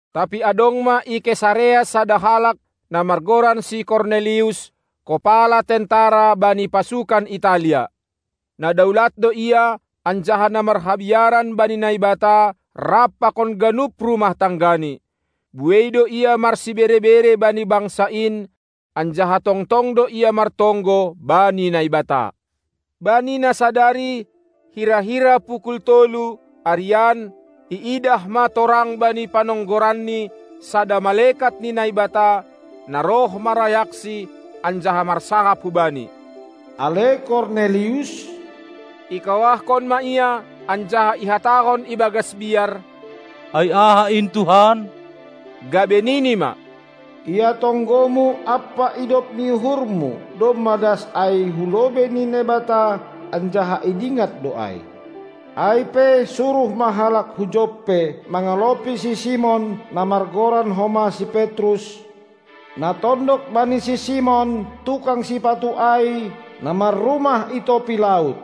Tapi adong ma i Kesarea sada halak, na margoran si Kornelius, kopala tentara bani pasukan Italia. Na daulat do ia anjaha na marhabiaran bani Naibata rap pakon ganup rumah tanggani. Buei do ia marsibere-bere bani bangsa in, anjaha tongtong do ia martonggo bani Naibata. Bani na sadari, hira-hira pukul tolu, arian, iidah ma torang bani panonggoranni sada malekat ni Naibata, na roh marayaksi anjaha marsahap hubani: Ale Kornelius! Ikawahkon ma ia anjaha ihatahon ibagas biar: Ai aha in Tuhan? Gabe nini ma: Ia tonggomu ampa idop ni uhurmu domma das ai hu lobei ni Naibata, anjaha idingat do ai. Ai pe suruh ma halak hu Joppe mangalopi si Simon, na margoran homa si Petrus, na tondok bani si Simon, tukang sipatu ai, na marrumah i topi laut.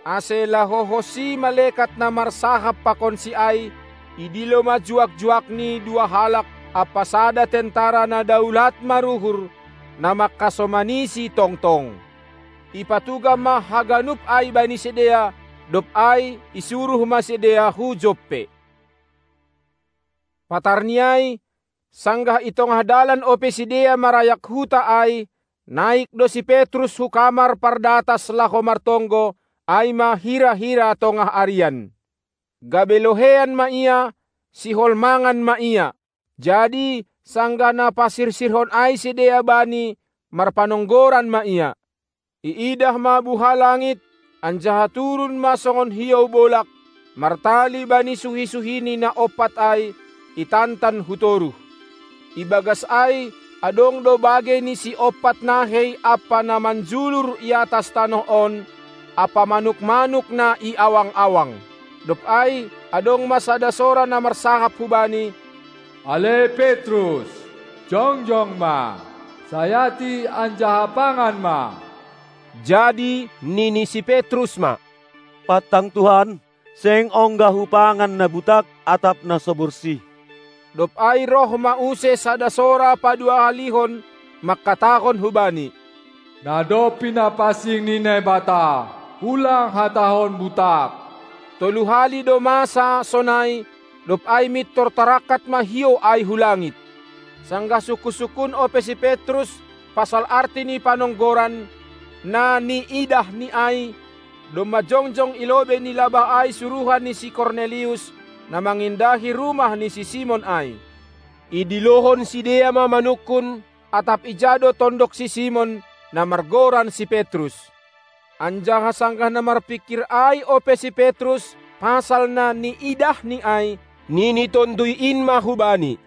Ase laho honsi malekat na marsahap pakonsi ai, idilo ma juak-juakni dua halak ampa sada tentara na daulat maruhur, na mangkasomanisi tongtong. Ipatugah ma haganup ai bani sidea, dob ai isuruh ma sidea hu Joppe. Patarni ai, sanggah i tongah dalan ope sidea marayak huta ai, naik do si Petrus hu kamar pardatas laho martonggo, ai ma hira-hira tongah arian. Gabe loheian ma ia, sihol mangan ma ia. Jadi sanggah na pasirsirhon ai sidea bani, marpanonggoran ma ia. Iidah ma buha langit, anjaha turun ma songon hiou bolag, martali bani suhi-suhini na ompat ai, itantan hu toruh. Ibagas ai adong do bagei ni siompat nahei ampa na manjulur i atas tanoh on ampa manuk-manuk na i awang-awang. Dob ai adong ma sada sora na marsahap hubani: Ale Petrus, jongjong ma, sayati anjaha pangan ma! Jadi nini si Petrus ma: Pantang Tuhan! Seng ongga hupangan na butak atap na so borsih. Dob ai roh ma use sada sora padua halihon, mangkatahon hubani: Na dob pinapansing ni Naibata ulang hatahon butak! Tolu hali do masa sonai, dob ai mintor tarangkat ma hiou ai hu langit. Sanggah sungkun-sungkun ope si Petrus pasal arti ni panonggoran, na niidahni ai, domma jongjong i lobei ni labah ai suruhan ni si Kornelius, na mangindahi rumah ni si Simon ai. Idilohon sidea ma manungkun, atap ijai do tondok si Simon, na margoran si Petrus. Anjaha sanggah na marpingkir ai ope si Petrus pasal na niidahni ai, nini Tonduy in ma hubani: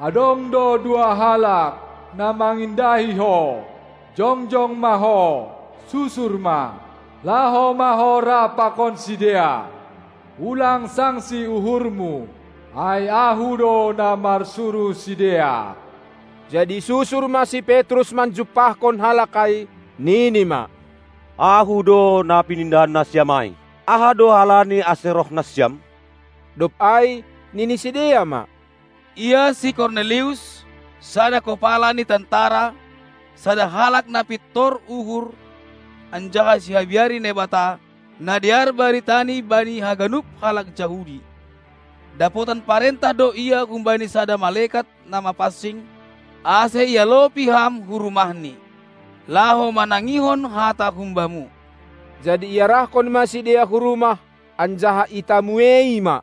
Adong do dua halak, na mangindahi ho! Jongjong ma ho, susur ma; laho ma ho rap pakon sidea, ulang sangsi uhurmu, ai Ahu do na marsuruh sidea! Jadi susur ma si Petrus manjumpahkon halak ai, nini ma: Ahu do na pinindahan nasiam ai! Aha do halani ase roh nasiam? Dob ai nini sidea ma: Ia si Kornelius, sada kopala ni tentara, sada halak na pintor uhur anjaha sihabiari Naibata, na dear baritani bani haganup halak Jahudi, dapotan parentah do ia humbani sada malekat na mapansing, ase ialopi ham hu rumahni, laho manangihon hata humbamu. Jadi iarahkon ma sidea hu rumah, anjaha itamuei ma.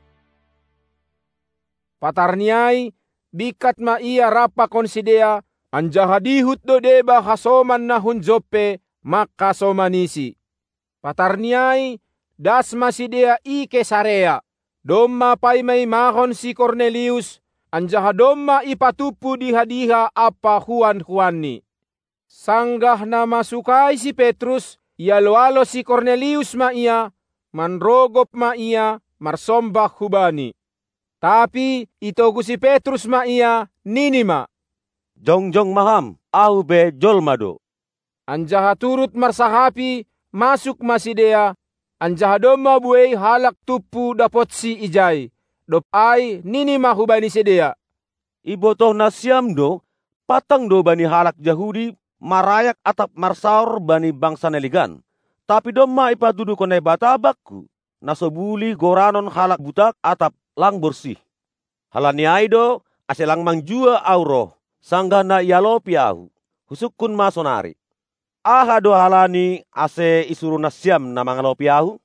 Patarni ai bingkat ma ia rap pakon sidea, anjaha dihut do deba hasoman na hun Joppe mangkasomanisi. Patarni ai das ma sidea i Kesarea. Domma paima-imahon si Kornelius, anjaha domma ipatumpu diha-diha ampa huan-huanni. Sanggah na masuk ai si Petrus, ialo-alo si Kornelius ma ia, manrogop ma ia marsombah hubani. Tapi itogu si Petrus ma ia, nini ma: Jongjong ma ham, ahu pe jolma do. Anjaha turut marsahapi masuk ma sidea, anjaha domma buei halak tumpu dapotsi ijai. Dob ai nini ma hubani sidea: Ibotoh nasiam do, pantang do bani halak Jahudi marayak atap marsaor bani bangsa na legan. Tapi domma ipatuduhkon Naibata bakku, na so bulih goranon halak butak atap lang borsih. Halani ai do, ase lang manjua ahu roh, sanggah na ialopi ahu. Husungkun ma sonari: Aha do halani, ase isuruh nasiam na mangalopi ahu?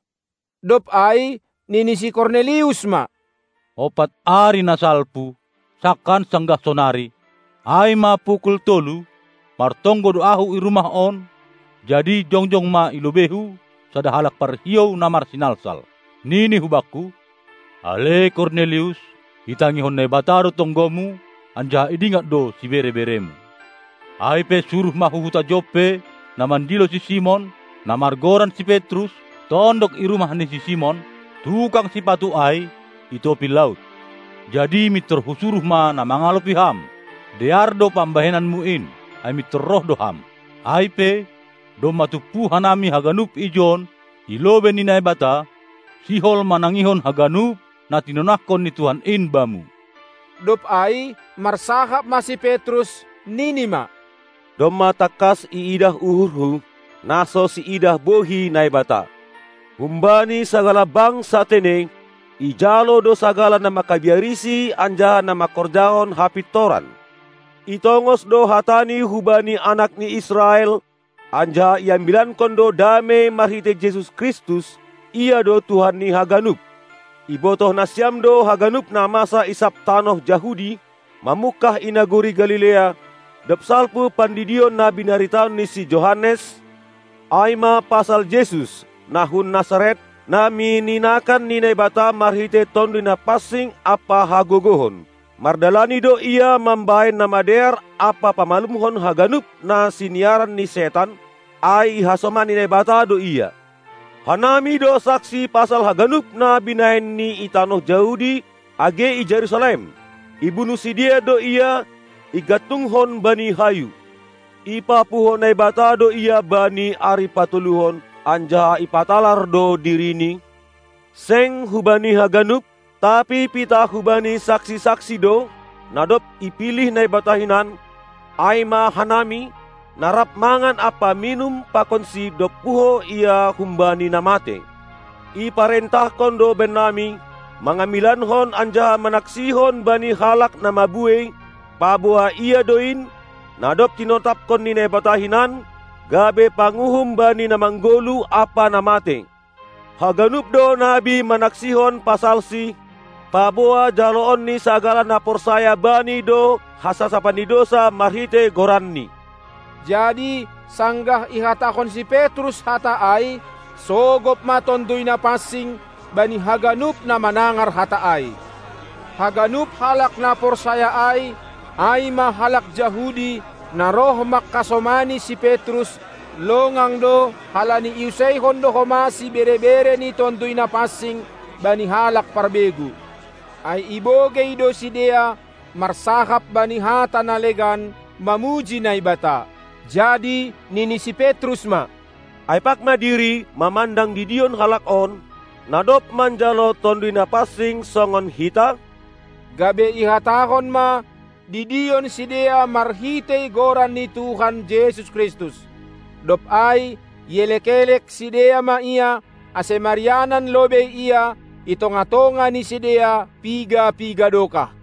Dob ai nini si Kornelius ma: Ompat ari na salpu, sangkan sanggah sonari, ai ma pukul tolu, martonggo do ahu i rumah on, jadi jongjong ma i lobeihu sada halak parhiou na marsinalsal. Nini hubakku: Ale Kornelius, itangihon Naibata do tonggomu anjaha idingat do sibere-beremu. Ai pe suruh ma hu huta Joppe na mandilo si Simon, na margoran si Petrus, tondok i rumah ni si Simon, tukang sipatu ai, i topi laut. Jadi mintor husuruh ma na mangalopi ham, dear do pambahenanmu in, ai mintor roh do ham. Ai pe, domma tumpu hanami haganup ijon i lobei ni Naibata, sihol manangihon haganup na tinonahkon ni Tuhan in bamu. Dob ai marsahap ma si Petrus, nini ma: Domma tangkas iidah uhurhu, na so siidah bohi Naibata. Humbani sagala bangsa tene, ijalo do sagala na mangkabiarisi anjaha na mangkorjahon hapintoran. Itongos do hatani hubani anak ni Israel, anjaha iambilankon do damei marhitei Jesus Kristus; Ia do Tuhan ni haganup. Ibotoh nasiam do haganup na masa i sab tanoh Jahudi, mamungkah i nagori Galilea, dob salpu pandidion na binaritahon ni si Johannes, ai ma pasal Jesus, na hun Nasaret, na mininakan ni Naibata marhitei Tonduy Napansing ampa hagogohon. Mardalani do Ia mambahen na madear ampa pamalumhon haganup na siniaran ni setan, ai ihasomani Naibata do Ia. Hanami do saksi pasal haganup na binahenNi i tanoh Jahudi age i Jerusalem. Ibunuh sidea do Ia, igantungkon bani hayu. Ipapuho Naibata do Ia bani ari patoluhon, anjaha ipatalar do diriNi, Seng hubani haganup, tapi pitah hubani saksi-saksi do, na dob ipilih Naibata hinan, ai ma hanami, na rap mangan ampa minum pakonSi dob puho Ia humbani na matei. Iparentahkon do bannami, mangambilankon anjaha manaksihon bani halak na mabuei, paboa Ia do in, na dob tinotapkon ni Naibata hinan, gabe panguhum bani na manggoluh ampa na matei. Haganup do nabi manaksihon pasalSi, paboa jaloon ni sagala na porsaya Bani do hasasapan ni dousa marhitei goranNi. Jadi sanggah ihatahon si Petrus hata ai, sogop ma Tonduy Napansing bani haganup na manangar hata ai. Haganup halak na porsaya ai, ai ma halak Jahudi, na roh mangkasomani si Petrus, longang do halani iuseihon do homa sibere-bere ni Tonduy Napansing bani halak parbegu. Ai ibogei do sidea marsahap bani hata na legan mamuji Naibata. Jadi nini si Petrus ma: Ai pag ma diri mamandang didion halak on, na dob manjalo Tonduy Napansing songon hita? Gabe ihatahon ma didion sidea marhitei Goran ni Tuhan Jesus Kristus. Dob ai ielek-elek sidea ma ia, ase marianan lobei ia i tongah-tongah ni sidea piga-piga dokah.